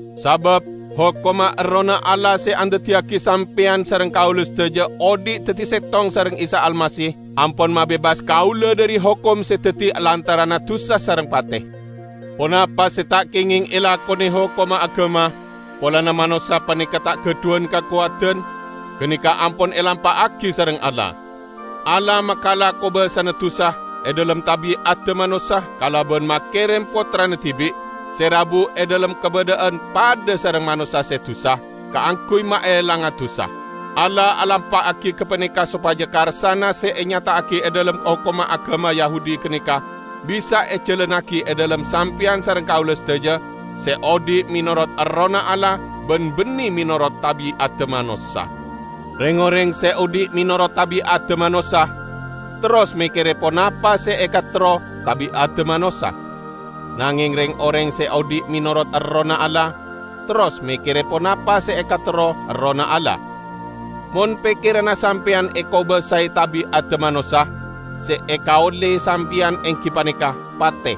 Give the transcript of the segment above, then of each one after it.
Sabab hokomma Errohna Allah se andaddiyagi sampeyan sareng kaula sadaja odhi' daddi settong sareng Isa Almasih ampon mabebas kaula dhari hokom se daddi lantaranna dusa sareng pate. Ponapa se ta' kengeng elakone hokomma agama, polana manossa paneka ta' gadhuwan kakowadan, ganeka ampon elampa'agi sareng Allah. Allah makala kobasana dusa e dhalem tabi'adda manossa kalaban makerem Pottrana dibi', se rabu e dhalem kabadha'an padha sareng manossa se dusa, kaangguy maelanga dusa. Allah alampa'agi gapaneka sopaja karsana se enyata'agi e dhalem hokomma agama Yahudi ganeka bisa ejalannagi e dhalem sampeyan sareng kaula sadaja se odhi' menorot Errohna Allah ban banne menorot tabi'adda manossa. Reng-oreng se odhi' menorot tabi'adda manossa terros mekkere ponapa se ekaterro tabi'adda manossa. Nangeng reng-oreng se odhi' menorot Errohna Allah, terros mekkere ponapa se ekaterro Errohna Allah. Mon pekkeranna sampeyan ekobasae tabi'adda manossa, se ekaolle sampeyan enggi paneka pate.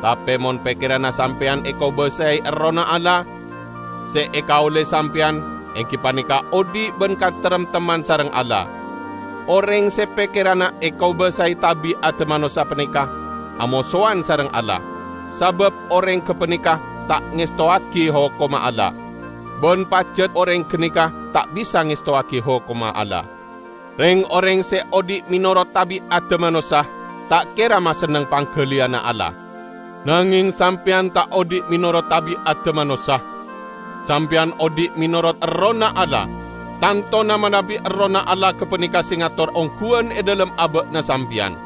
Tape mon pekkeranna sampeyan ekobasae Errohna Allah, se ekaolle sampeyan enggi paneka odhi' ban kataremtemman sareng Allah. Oreng se pekkeranna ekobasae tabi'adda manossa paneka amosowan sareng Allah; sabab oreng gapaneka ta' ngestowagi hokomma Allah; ban pajat oreng ganeka ta' bisa ngestowagi hokomma Allah. Reng-oreng se odhi' menorot tabi'adda manossa, ta' kera masenneng panggaliyanna Allah. Nangeng sampeyan ta' odhi' menorot tabi'adda manossa. Sampeyan odhi' menorot Errohna Allah -- tantona manabi Errohna Allah gapaneka se ngator ongguwan e dhalem aba'na sampeyan.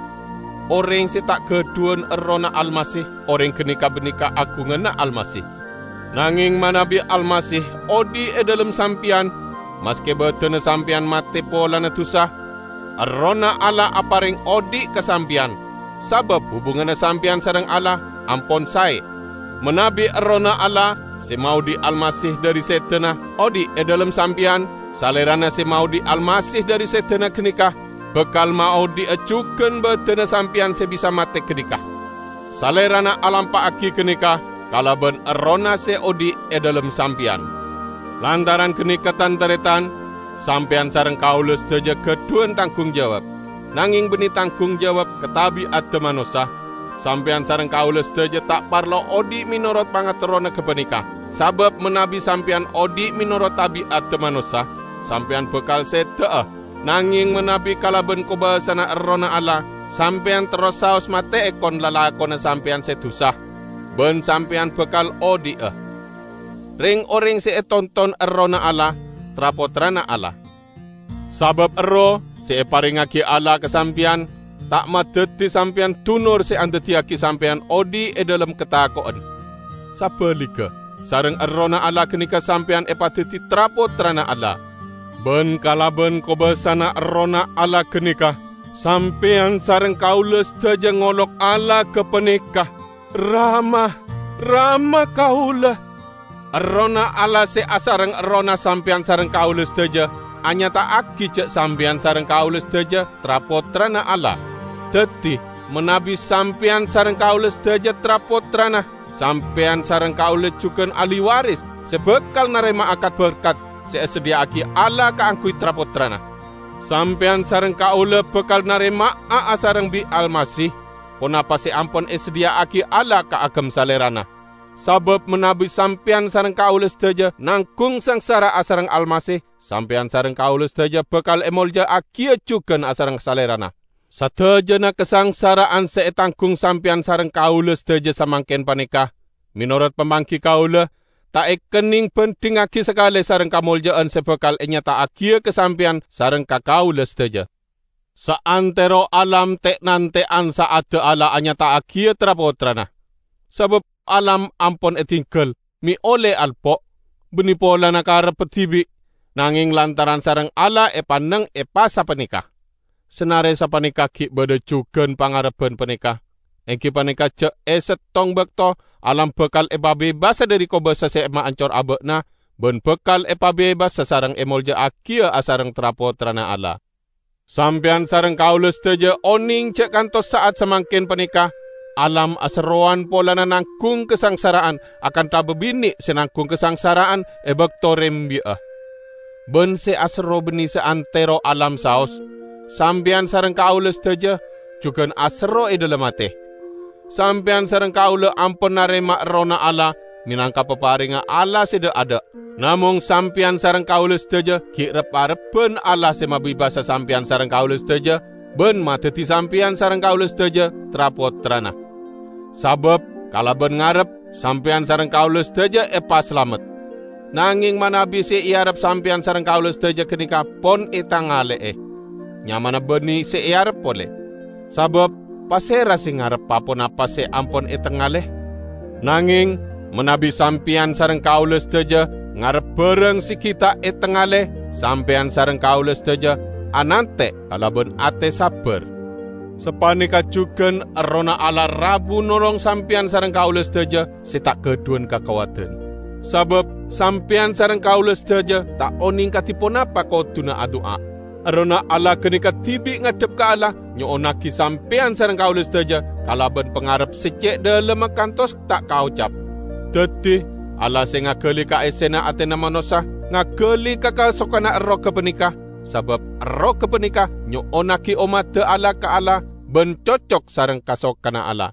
Oreng se ta' gadhuwan Errohna Almasih, oreng ganeka banne kaagunganna Almasih. Nangeng manabi Almasih odhi' e dhalem sampeyan, maske badanna sampeyan mate polana dusa, Errohna Allah apareng odhi' ka sampeyan, sabab hubunganna sampeyan sareng Allah ampon sae. Manabi Errohna Allah, se maodhi' Almasih dhari sedana, odhi' e dhalem sampeyan, Salerana se maodhi' Almasih dhari sedana ganeka, bakal maodhi'a jugan badanna sampeyan se bisa mate ganeka. Salerana alampa'agi ganeka kalaban Errohna se odhi' e dhalem sampeyan. Lantaran ganeka, tan-taretan, sampeyan sareng kaula sadaja gadhuwan tanggung jawab; nangeng banne tanggung jawab ka tabi'adda manossa; sampeyan sareng kaula sadaja ta' parlo odhi' menorot pangaterrona gapaneka. Sabab manabi sampeyan odhi' menorot tabi'adda manossa, sampeyan bakal seda'a; nangeng manabi kalaban kobasana Errohna Allah, sampeyan terros saos mate'e kon-lalakonna sampeyan se dusa, ban sampeyan bakal odhi'a. Reng-oreng se etonton Errohna Allah, tra-pottrana Allah. Sabab Erroh, se eparengngagi Allah ka sampeyan, ta' madaddi sampeyan dunor se andaddiyagi sampeyan odhi' e dhalem katako'en. Sabaligga, sareng Errohna Allah ganeka sampeyan epadaddi tra-pottrana Allah. Ban kalaban kobasana Errohna Allah ganeka sampeyan sareng kaula sadaja ngolok Allah gapaneka, "Rama, Rama kaula!" Errohna Allah se asareng errohna sampeyan sareng kaula sadaja anyata'agi ja' sampeyan sareng kaula sadaja tra-pottrana Allah. Daddi, manabi sampeyan sareng kaula sadaja tra-pottrana, sampeyan sareng kaula jugan ahli waris se bakal narema'a kat-berkat se esadhiya'agi Allah kaangguy tra-pottrana. Sampeyan sareng kaula bakal narema'a asareng bi' Almasih ponapa se ampon esadhiya'agi Allah kaagem Salerana; sabab manabi sampeyan sareng kaula sadaja nanggung sangsara asareng Almasih sampeyan sareng kaula sadaja bakal emolja'agiya jugan asareng Salerana. Sadajana kasangsara'an se etanggung sampeyan sareng kaula sadaja samangken paneka, menorot pamanggi kaula, ta' ekenneng bandhingngagi sakale sareng kamolja'an se bakal enyata'agiya ka sampeyan sareng ka kaula sadaja. Saantero alam te'nante'an sa'adda Allah anyata'agiya tra-pottrana. Sabab alam ampon edinggal me' olle alpo', banne polana karebba dibi', nangeng lantaran sareng Allah epanneng epasapaneka. Sanare sapaneka gi' badha jugan pangarebban paneka: enggi paneka ja' e settong bakto alam bakal epabebasa dhari kobasa se maancor aba'na ban bakal epabebasa sareng emolja'agiya asareng tra-pottrana Allah. Sampeyan sareng kaula sadaja oneng ja' kantos sa'at samangken paneka alam aserrowan polana nanggung kasangsara'an akantha babine' se nanggung kasangsara'an e bakto rembi'a. Ban se aserro banne saantero alam saos; sampeyan sareng kaula sadaja jugan aserro e dhalem ate. Sampeyan sareng kaula ampon narema Errohna Allah menangka paparengnga Allah se dha'-adha', namong sampeyan sareng kaula sadaja gi' rep-arebban Allah se mabebasa sampeyan sareng kaula sadaja ban madaddi sampeyan sareng kaula sadaja tra-pottrana. Sabab kalaban ngarep, sampeyan sareng kaula sadaja epasalamet. Nangeng manabi se earep sampeyan sareng kaula sadaja ganeka pon etangale'e, nyamana banne se earep pole. Sabab pasera se ngarep pa-ponapa se ampon etengale? Nangeng manabi sampeyan sareng kaula sadaja ngarep barang se gi' ta' etengale, sampeyan sareng kaula sadaja anante' kalaban ate sabbar. Sapaneka jugan Errohna Allah rabu nolong sampeyan sareng kaula sadaja se ta' gadhuwan kakowadan. Sabab sampeyan sareng kaula sadaja ta' oneng kadi ponapa koduna adu'a; Errohna Allah ganeka dibi' ngadhep ka Allah nyo'onnagi sampeyan sareng kaula sadaja kalaban pangarep se ce' dhalemma kantos ta' kaocap. Daddi Allah se ngagali ka essena atena manossa, ngagali ka kasokanna Erroh gapaneka; sabab Erroh gapaneka nyo'onnagi ommadda Allah ka Allah, ban cocok sareng kasokanna Allah.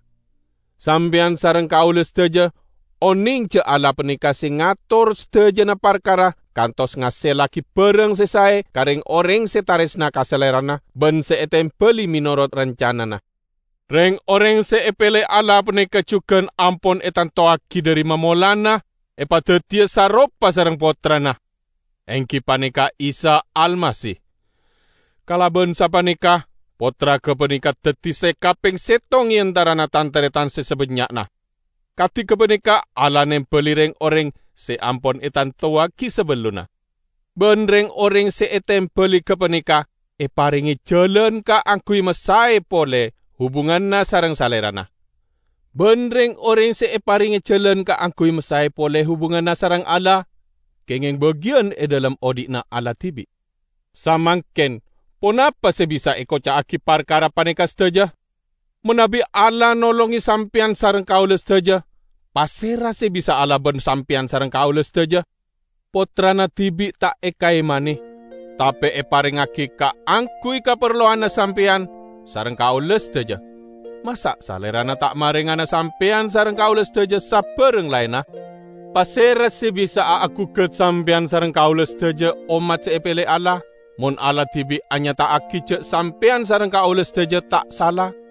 Sampeyan sareng kaula sadaja oneng ja' Allah paneka se ngator sadajana parkara kantos ngasellagi barang se sae ka reng-oreng se taresna ka Salerana ban se etembali menorot rancanana. Reng-oreng se epele Allah paneka jugan ampon etantowagi dhari mamolanna epadaddiya saropa sareng Pottrana, enggi paneka Isa Almasih. Kalaban sapaneka Pottra gapaneka daddi se kapeng settong e antarana tan-taretan se sabannya'na. Kadi gapaneka Allah nembali reng-oreng se ampon etantowagi sabellunna; ban reng-oreng se etembali gapaneka eparenge jalan kaangguy masae pole hubunganna sareng Salerana. Ban reng-oreng se eparenge jalan kaangguy masae pole hubunganna sareng Allah, kengeng bagiyan e dhalem odhi'na Allah dibi'. Samangken ponapa se bisa ekoca'agi parkara paneka sadaja? Manabi Allah nolonge sampeyan sareng kaula sadaja, pasera se bisa alaban sampeyan sareng kaula sadaja? Pottrana dibi' ta' ekaemane, tape eparengngagi kaangguy kaparlowanna sampeyan sareng kaula sadaja; masa' Salerana ta' marengana sampeyan sareng kaula sadaja sabarang laenna? Pasera se bisa'a agugat sampeyan sareng kaula sadaja ommat se epele Allah, mon Allah dibi' anyata'agi ja' sampeyan sareng kaula sadaja ta' sala?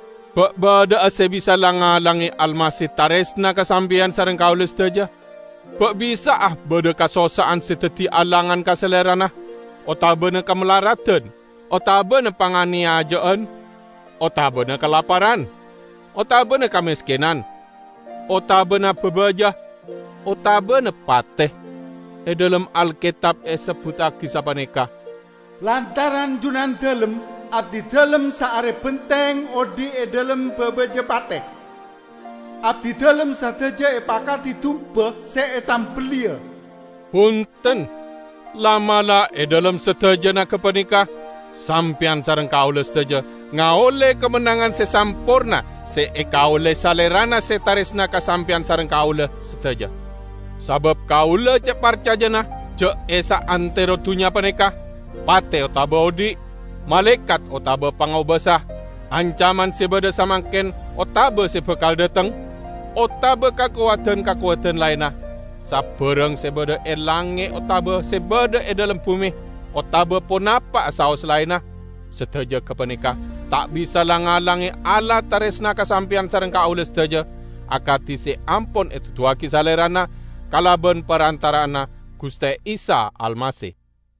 Ba' badha'a se bisa lang-ngalange Almasih taresna ka sampeyan sareng kaula sadaja? Ba' bisa'a badha kasossa'an se daddi alangan ka Salerana, otabana kamalaradan, otabana panganeyaja'an, otabana kalaparan, otabana kameskenan, otabana babaja, otabana pate? E dhalem Alketab esebbuttagi sapaneka, "Lantaran Junandalem, abdidalem saare benteng odhi' e dhalem babaja pate. Abdidalem sadaja epakadi dumba se esambelliya." Bunten! La'-mala' e dhalem sadajana gapaneka sampeyan sareng kaula sadaja ngaolle kamennangan se samporna se ekaolle Salerana se taresna ka sampeyan sareng kaula sadaja. Sabab kaula ce' parcajana ja' e saantero dunnya paneka, pate otaba odhi', malaekat otaba pangobasa, ancaman se badha samangken otaba se bakal dhateng, otaba kakowadan-kakowadan laenna, sabarang se badha e langnge' otaba se badha e dhalem bume otaba ponapa'a saos laenna, sadaja gapaneka ta' bisa lang-ngalange Allah taresna ka sampeyan sareng kaula sadaja, akadi se ampon eduduwagi Salerana kalaban parantara'anna Guste Isa Almasih.